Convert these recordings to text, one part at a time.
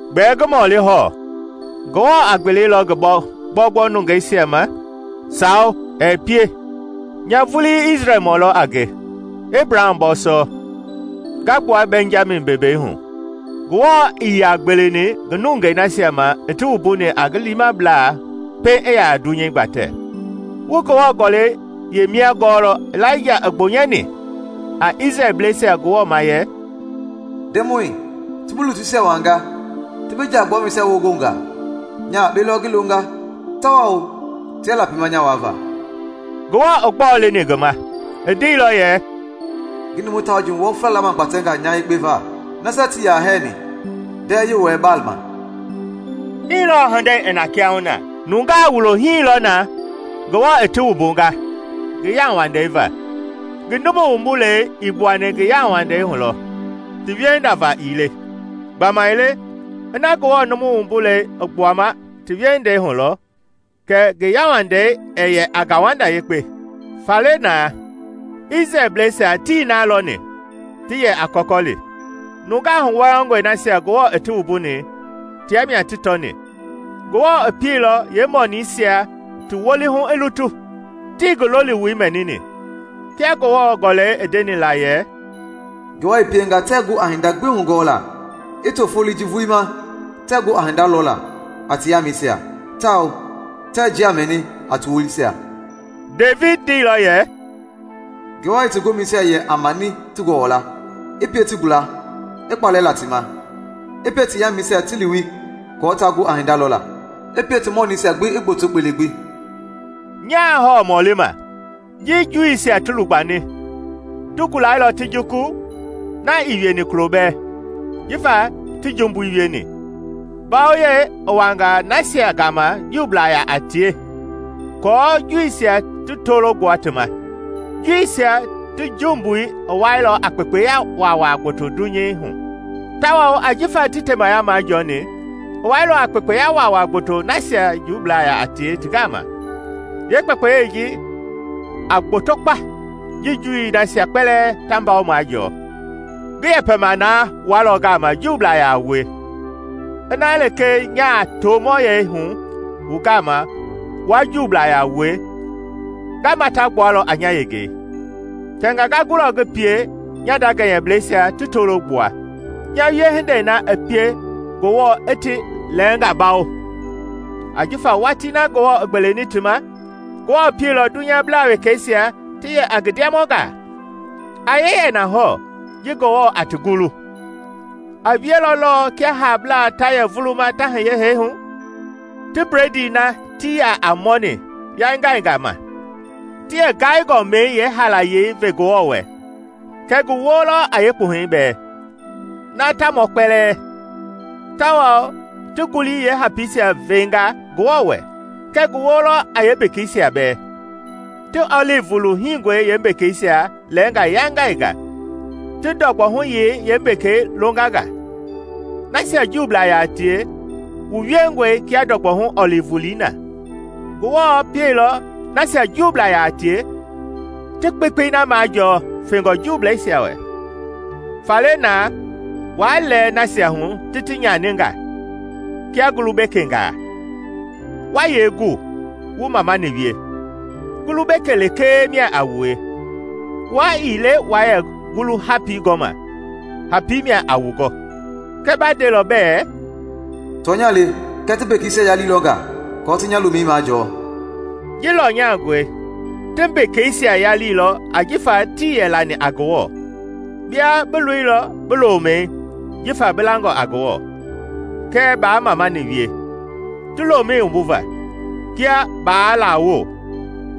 Gbɛɛ ngi mɔli hɔɔ: Ngewɔ a gbelelɔ ngi gbɔugbɔu nungeisia ma? Sawo, ɛɛ pie! Nya vulii Isrɛlmɔ lɔ a nge, Ebraham bɔɔsɔ, nga gbua Bɛnjami bembei hu. Ngewɔ ii yaa gbeleni ngi nungei nasia ma i ti wumbuni a ngi liimablaa pɛiŋ i ya a dunyei gbatɛ. Wu Ngewɔ Gɔlɛi yeemia gɔɔlɔ Ilaija i gbonyɛni a Isrɛlbleisia Ngewɔ ma yɛ, “Ndemɔi, ti bi lutuisia waanga, ti bi jaa-gbuamɛisia wongonga: nya yakpe lɔ ngi longa tawao tia lapima nya waava.” Ngewɔ i gbɔɔ leni ngi ma? I ndeilɔ yɛ, “Ngi numu Tauji wɔfla lamagbatɛnga nya yekpe va, nasia tii yaa hɛɛni ndɛɛ-Yewɔɛi Baal ma.” Hii lɔɔ hindei i na kiahuna: Nungaa wulohii lɔ na Ngewɔ i ti wumbunga a ngi yauwandei va. Ngi numu wumbulei i gbuani ngi yauwandei hu lɔ, ti wiehinda va ii le. Gbamaile ina Ngewɔ numu wumbulei i gbuama ti wiehindei hu lɔ, kɛ ngi yauwandei ɛɛ yɛ a ngauwanda yekpe. Faale naa Isrɛlbleisia tii na lɔni ti yɛ a kɔkɔli. Nungaa huwɔyɔngɔi nasia Ngewɔ i ti wumbuni tia mia ti tɔni; Ngewɔ i pieilɔ yeemɔniisia ti wolii hu i lutu, tii ngi loliwoi mɛnini. Kia Ngewɔ Gɔlɛi i ndeni la yɛ, “Ngewɔ i pienga tɛɛ gu a hinda gbi hugɔɔlaa; i to foloi ji vulii ma tɛɛ gu a hinda lɔlaa a ti yaamɛisia tawao tɛɛ njia mɛni a ti wolisia.” Devidi ndeilɔ yɛ, “Ngewɔ i ti gomɛisia yɛ a mani ti gɔwɔla, i pie ti gula, i kpalɛ la ti ma! I pie ti yaamɛisia ti liwi kɔɔ taa gu a hinda lɔla; i pie ti mɔnɛisia ti gboto kpele gbi.” Nyaa hɔɔ mɔlima: Ji Juuisia ti lugbani, ti gulailɔ ti juku? Na ii wieni kulo bɛɛ! Jifa ti jumbui wieni, mbawoyei i wanga nasia Juublaa yaa tie ti gama, aako Juuisia ti tolo gbua ti ma. Juuisia ti jumbui i wailɔ a kpekpeya waawaa gboto dunyei hu, tawao jifa tii temaya majɔɔni, i wailɔ a kpekpeya waawaa gboto nasia Juublaa yaa tie ti gama. Yeekpekpeyei ji a gboto kpa ji Juuisia nasia kpɛlɛɛ ta mbawo majɔɔ! Ngi yɛpɛma naa wualɔ gama Juublaa yaa wue: ina lekee nyaa tomɔyɛi hu wu gama wua Juublaa yaa wue, nga mata gbualɔ a nya yengei. Tɛnga nga gulɔ ngi pie nya nda gɛnyɛblɛisia ti tolo gbua, nya wiehindei na i pie Ngewɔ i ti lɛɛngaa bawo. Ajifa watii na Ngewɔ i gbeleni ti ma, Ngewɔ pieilɔ dunyablaa wekeisia ti yɛ a ngi ndiamɔngaa. A yee yɛ na hɔɔ ji Ngewɔ a ti gulu? A wielɔ lɔɔ kia haablaa ta yɛ vuluma ta hiye hee hu! Ti bledii na tii yaa a mɔni yaingaingaa ma, ti yeengaingɔmɛi yeehaalayei ve Ngewɔ wɛ, kɛ ngi woo lɔ a yeekpuhɛi bɛɛ na ta mɔɔ kpɛlɛɛ; tawao ti ngulii yeehapiisia vengaa Ngewɔ wɛ, kɛ ngi woo lɔ a yeembekeisia bɛɛ. Ti ɔlivi wulu hingɔi yeembekeisia lɛɛnga yaingainga ti ndɔgbɔhuyei yeembekei longa nga. Nasia Juublaa yaa tie wu wiengɔe kia ndɔgbɔhu ɔlivi wulii na, Ngewɔ pielɔ nasia Juublaa yaa tie ti kpekpei na majɔɔ fɛngɔ Juuisia wɛ. Faale na waa lɛɛ nasia hu ti ti yaini nga kia ngulu- bekengaa. Wa yee gu wu mamani wie? Ngulu-beke lekee mia a wue; wua ii le waa yɛ ngulu hapii gɔma hapii mia a wu gɔ. Kɛɛ ba ndelɔ bɛɛ, “Tɔnya le, kɛɛ ti mbekeisia yaliilɔ nga aako ti nya lomɛi majɔɔ.” Ji lɔnyangɔe. Ti mbekeisia yaliilɔ ajifa tii yɛ lani a Ngewɔ, bia bi loilɔ bi lomɛi jifa bi langɔ a Ngewɔ, kɛɛ baa mamani wie ti lomɛi wumbuva; kia baa lawo,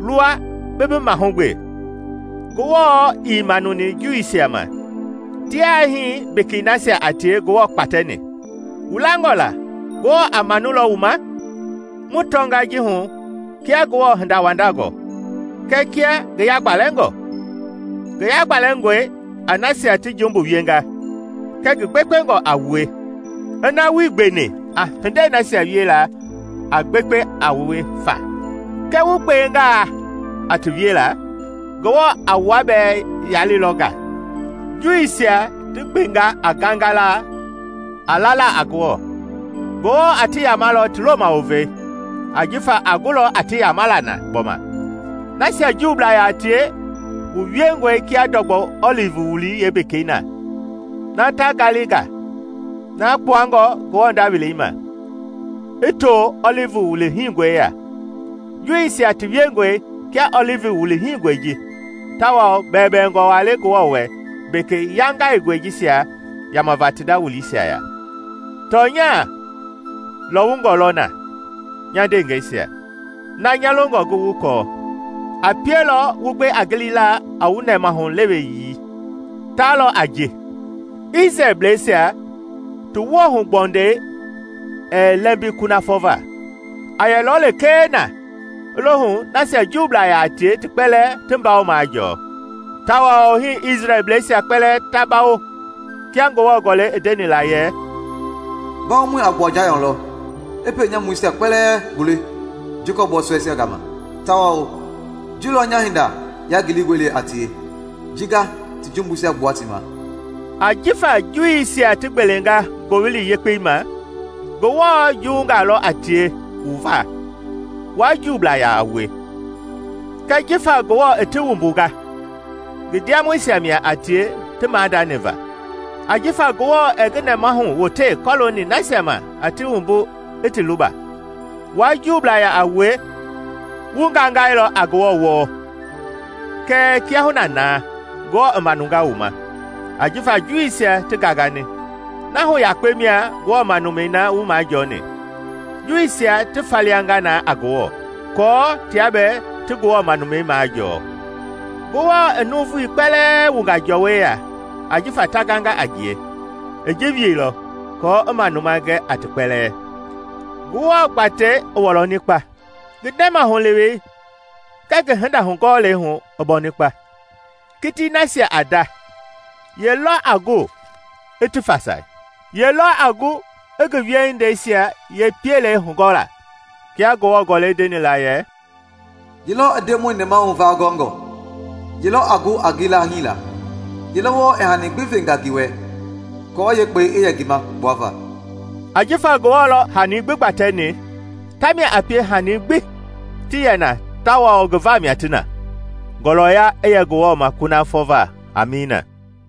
luwa bi bi mahugbe. Ngewɔ ii manuni Juuisia ma, tia hii mbekei nasia a tie Ngewɔ kpatɛni; wu langɔ la a manulɔ wu ma? Mu tɔnga ji hu kia Ngewɔ hindawandangɔ kɛɛ kia ngi yagbalɛngɔ. Ngi yagbalɛngɔe a nasia ti jumbu wienga, kɛɛ ngi gbekpengɔ a wue -- ina wuii gbeni a hindei nasia wiela a gbekpe a wue fa; kɛɛ wu gbengaa a ti wiela, Ngewɔ a wua bɛɛ yalilɔ nga. Juuisia ti gbengaa a gangalaa a lala a Ngewɔ, Ngewɔ a ti yamalɔ ti loma wovei, ajifa a gulɔ a ti yamala na gbɔma. Nasia Juublaa yaa tie wu wiengɔe kia ndɔgbɔhu ɔlivi wulii yeembekei na ta ngali nga, na kpuangɔ Ngewɔ nda welei ma, ti too ɔlivi wulu hingɔe ya. Juuisia ti wiengɔe kia ɔlivi wulu hingɔi ji; tawao bɛwɛbɛwɛngɔ waa le Ngewɔ wɛ mbeke yaingaingɔi jisia yamava ti nda wuliisia ya. Tɔnya lɔwungɔ lɔ na, nya ndeengɛisia, na nya longɔ wu kɔɔ. A pielɔ wu gbe a gilila a wu nɛmahu leweyii. Ta lɔ a ji: Isrɛlbleisia ti woohugbɔndɛi ɛɛ lɛɛmbi kunafɔ va, a yɛlɔ lekee na i lo hu nasia Juublaa yaa tie ti kpɛlɛɛ ti mbawo majɔɔ. Tawao hii Isrɛlbleisia kpɛlɛɛ ta bawo. Kia Ngewɔ Gɔlɛi i ndeni la yɛ, “Mbawomɔi a gbua Jayɔn lɔ, i pienyamuisia kpɛlɛɛ gbule Jacɔpi bɔɔsɔɛisia gama, tawao ji lɔ nya hinda yangilingɔi le a tie, ji nga ti jumbuisia gbua ti ma.” Ajifa Juuisia ti gbelenga Ngowili Yekpei ma, Ngewɔ juwunga lɔ a tie wu va, wua Juublaa yaa wie. Kɛɛ jifa Ngewɔ i ti wumbunga, ngi ndiamɔisia mia a tie ti maadani va. Ajifa Ngewɔ ɛɛ ngi nɛmahu wote kɔlooni nasia ma a ti wumbu i ti luba. Wua Juublaa yaa a wie, wu gangailɔ a Ngewɔ wɔɔ; kɛɛ kiahuna na Ngewɔ i manunga wu ma ajifa Juuisia ti gangani. Na hu yakpe mia Ngewɔ manumɛi na wu majɔɔni, Juuisia ti falianga na a Ngewɔ, aako tia bɛɛ ti Ngewɔ manumɛi majɔɔ. Ngewɔ i nuuvui kpɛlɛɛ wunga jɔɔwɔ ya ajifa ta ganga a ngie; i ji wielɔ aako i manuma gɛ a ti kpɛlɛɛ. Ngewɔ gbatei i wɔlɔni kpa! Ngi nɛmahulewei kɛɛ ngi hindahugɔɔlei hu i bɔni kpa! Kitii nasia a nda, ye lɔ a gu i fasai? Ye lɔ a gu a ngi wiehindeisia yee piele hugɔɔla? Kia Ngewɔ Gɔlɛi ndeni la yɛ, “Yelɔ i Ndemɔi nɛmahu va gɔngɔ? Yelɔ a gu a ngi laahiila? Yelɔ wɔɔ i hani gbi venga ngi wɛ, aako yeekpɛi i yɛ ngi ma kpuava?” Ajifa Ngewɔ lɔ i hani gbi gbatɛni, tamia a pie hani gbi ti yɛ na tawao ngi vamia ti na. Ngɔlɔya i yɛ Ngewɔ wɛ kunafɔ va. Amiina.